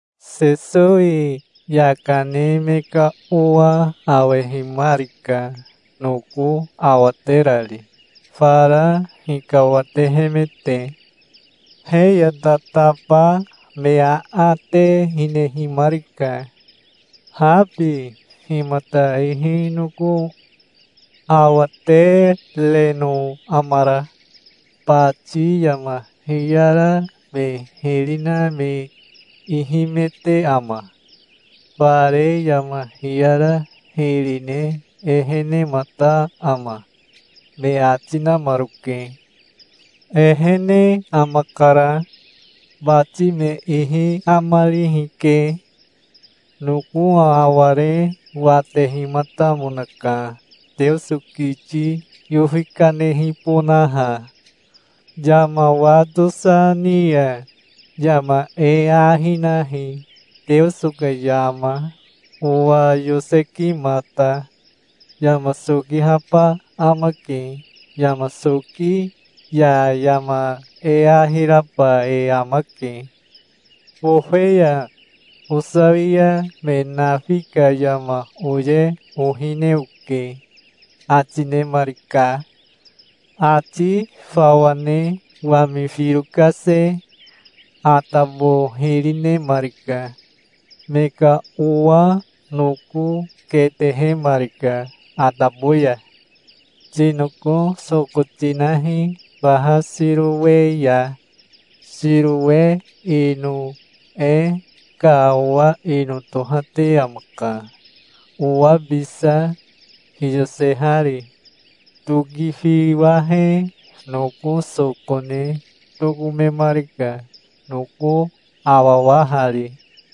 Sesowi yaka ne me ka owa awehimarika noko awaterari, fara hikawatehemete. He ya tataba me aate hinehimarika. "Habi himata ihi noko awatereno amara? Bati yama hiyara me hiri na me ihimete ama? Fare yama hiyara hiri ne ehenemata ama?" me ati namaroke. "Ehene amakara. Bati me ihi amarihi ke. Noko aware watehimatamonaka, Teoso kiti yofi kanehibonaha. Yama wa tosa ni ya yama e ahi nahi, Teoso ka yama, owa yosekimata. Yama sokihaba amake. Yama soki ya yama e ahi raba e amake. Bofe ya osawia me nafi ka yama oye ohine oke", ati nemarika. Ati fawa ne wami firo kase atabo hiri nemarika. Me ka owa noko ketehemarika atabo ya. "Tinoko soko tinahi faha Sirowe ya". (Sirowe ino e ka owa ino tohate amaka, owabisa hiyosehari.) Tokifiwahe noko soko ne tokomemarika, noko awawahari.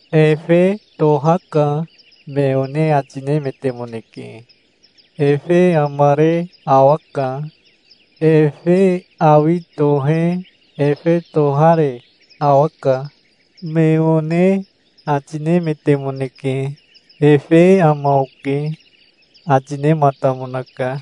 "Efe tohaka", me one ati nemetemoneke. "Efe amare awaka. Efe awi tohe efe tohare awaka", me one ati, nemetemoneke. "Efe ama oke", ati nematamonaka.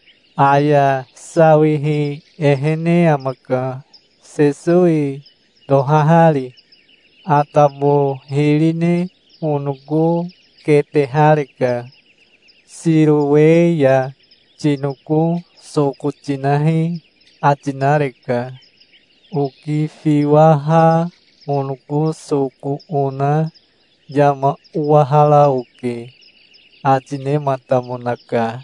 "Aya sawihi ehene amaka, Sesowi tohahari. Atabo hiri ne onoko ketehareka. 'Sirowe ya tinoko soko tinahi', ati nareka. Okifiwaha onoko soko ona yama owahara oke", ati nematamonaka.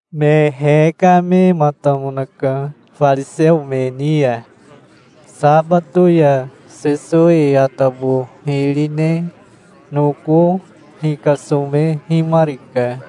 Me hekamematamonaka fariseo me ni ya. Sabato ya Sesowi atabo hiri ne noko hikasomehimarika.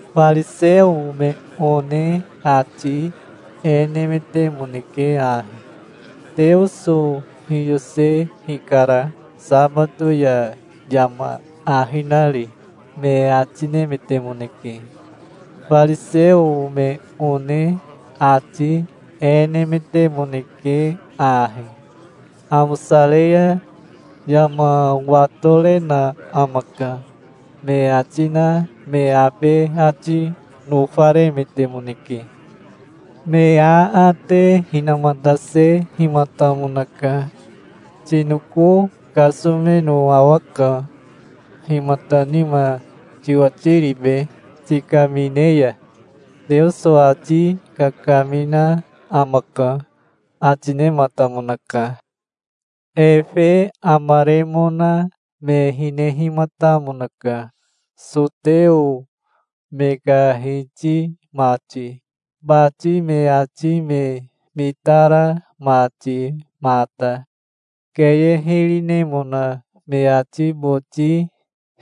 Fariseo me one ati e nemetemoneke ahi: "Teoso hiyose hikara, sabato ya yama ahi nari", me ati nemetemoneke. Fariseo me one ati e nemetemoneke ahi: "Amosare ya yama watorena amaka", me ati na me abe ati nofaremetemoneke. Me aate hinamatasehimatamonaka. "Tinoko kasomeno awaka. Himata nima tiwatiribe, tikamine ya?" "Teoso ati kakamina amaka", ati nematamonaka. Efe amaremona me hinehimatamonaka, soteo me ka hiti mati, bati me ati me mitara mati mata. Keye hiri nemona me ati boti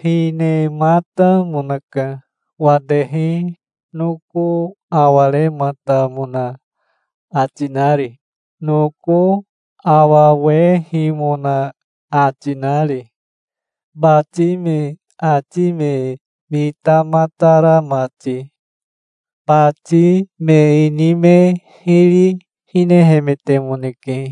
hinematamonaka, watehi noko awarematamona ati nari, noko awawehimona ati, nari, bati me ati me mitamatara mati. Bati me ini me hiri hinehemetemoneke,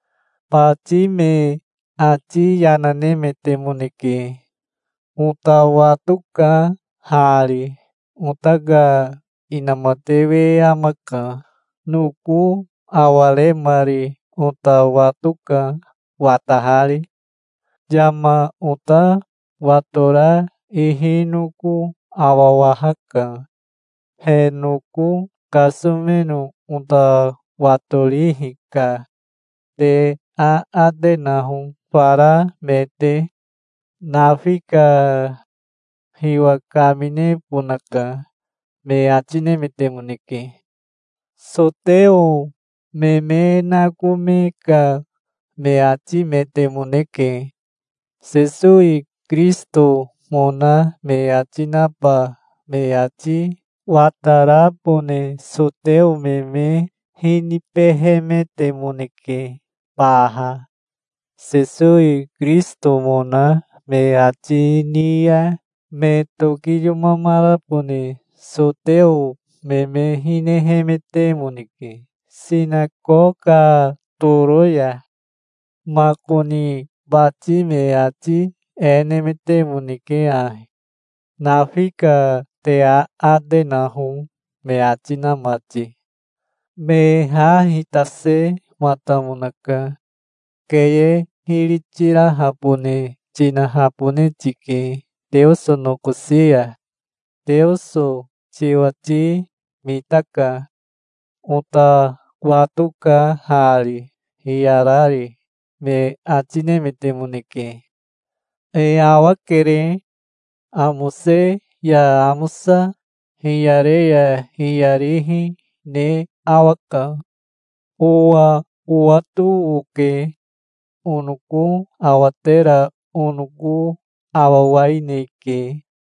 Bati me ati yana nemetemoneke. "Ota watoka hari. Ota ka inamatewe amaka. Noko awaremari ota watoka, watahari. Yama ota watora ihi noko awawahaka. He noko kasomeno ota watorihi ka. Te aate naho fara me te. Nafika. Hiwa kaminebonaka", me ati nemetemoneke. Soteo me me nakome ka me atimetemoneke. Sesowi Kirisitomona me ati naba me ati watarabone soteo me me hinibehemetemoneke baha. Sesowi Kirisitomona me ati ni ya me tokiyomamarabone soteo me me hinehemetemoneke sinakoka toro ya. Makoni bati me ati e nemetemoneke ahi: "Nafika. Te aate naho", me ati na mati. Me ha hitasematamonaka. "Keye hiri tirahabone tinahabone tike Teoso nokosi ya. Teoso tiwati mitaka. Ota watoka hari, hiyarari", me ati nemetemoneke. "E awakere. Amose ya amosa, hiyare ya hiyarihi ne awaka. Owa owato oke. Onoko awatera onoko awawaineke",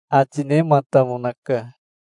ati nematamonaka.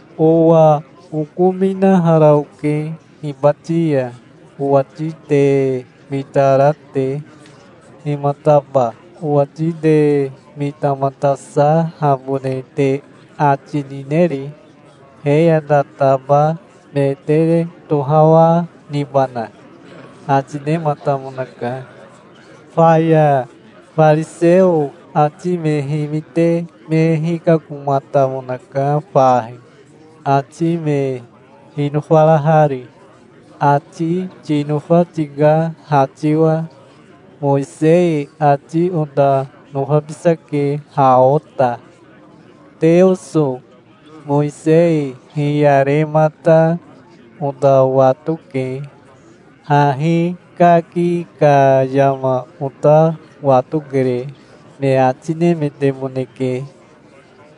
"Owa okominahara oke hibati ya, owati te mitara te. Himataba owati te mitamatasahabone te ati nineri? He ya tataba me te tohawa nibana?" ati nematamonaka. Faya fariseo ati me himite me hikakomatamonaka fahi, ati me hinofarahari. "Ati tinofa tika ha tiwa. Mowisei ati ota nofabisake ha ota. Teoso Mowisei hiyaremata ota watoke. Hahi kaki ka yama ota watokere", me ati nemetemoneke.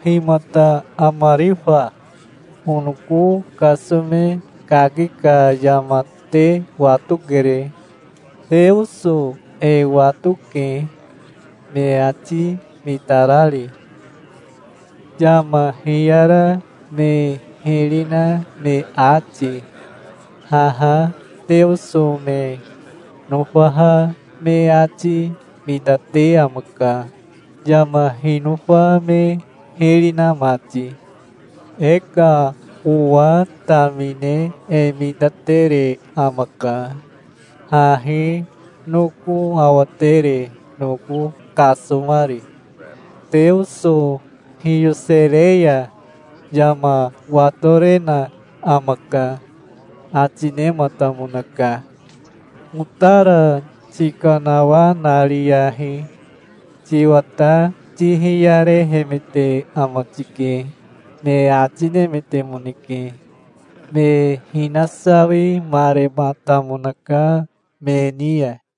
"Himata amari fa? Onoko kasome kaki ka yama te watokere. Teoso e watoke, me ati mitarari, yama hiyara me hiri na me ati. Haha Teoso me nofaha me ati mitate amaka, yama hinofa me hiri na mati. E ka owa tamine e mitatere amaka, hahi noko awatere noko kasomari. Teoso hiyosere ya yama watorena amaka", ati nematamonaka. "Otara tikanawanariyahi. Tiwata tihiyarehemete ama tike", me ati nemetemoneke. Me hinasawimarematamonaka me ni ya.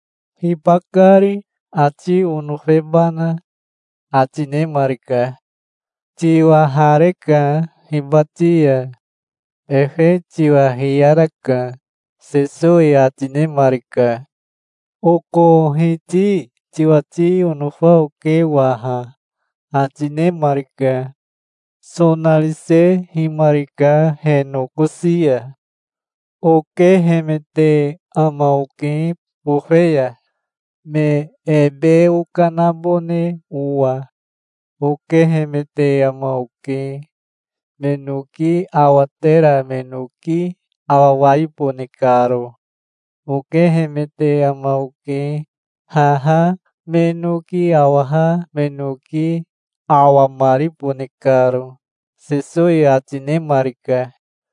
"Hibakari, ati onofebana?" ati nemarika. "Tiwahareka hibati ya. Efe tiwa hiyaraka", Sesowi ati nemarika. "Oko Hiti tiwati onofa oke waha", ati nemarika. Sonarisehimarika he nokosi ya. "Okehemete ama oke bofe ya, me ebe okanabone owa. Okehemete ama oke, me noki awatera me noki awawaibone karo. Okehemete ama oke, haha me noki awaha me noki awamaribone karo", Sesowi ati nemarika.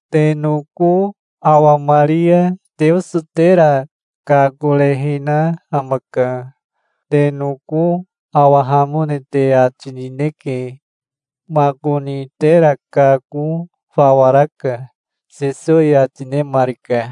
"Te noko awamari ya Teoso tera kakorehina amaka. Te noko awahamone te ati nineke. Makoni tera kako fawa raka", Sesowi ati nemarika.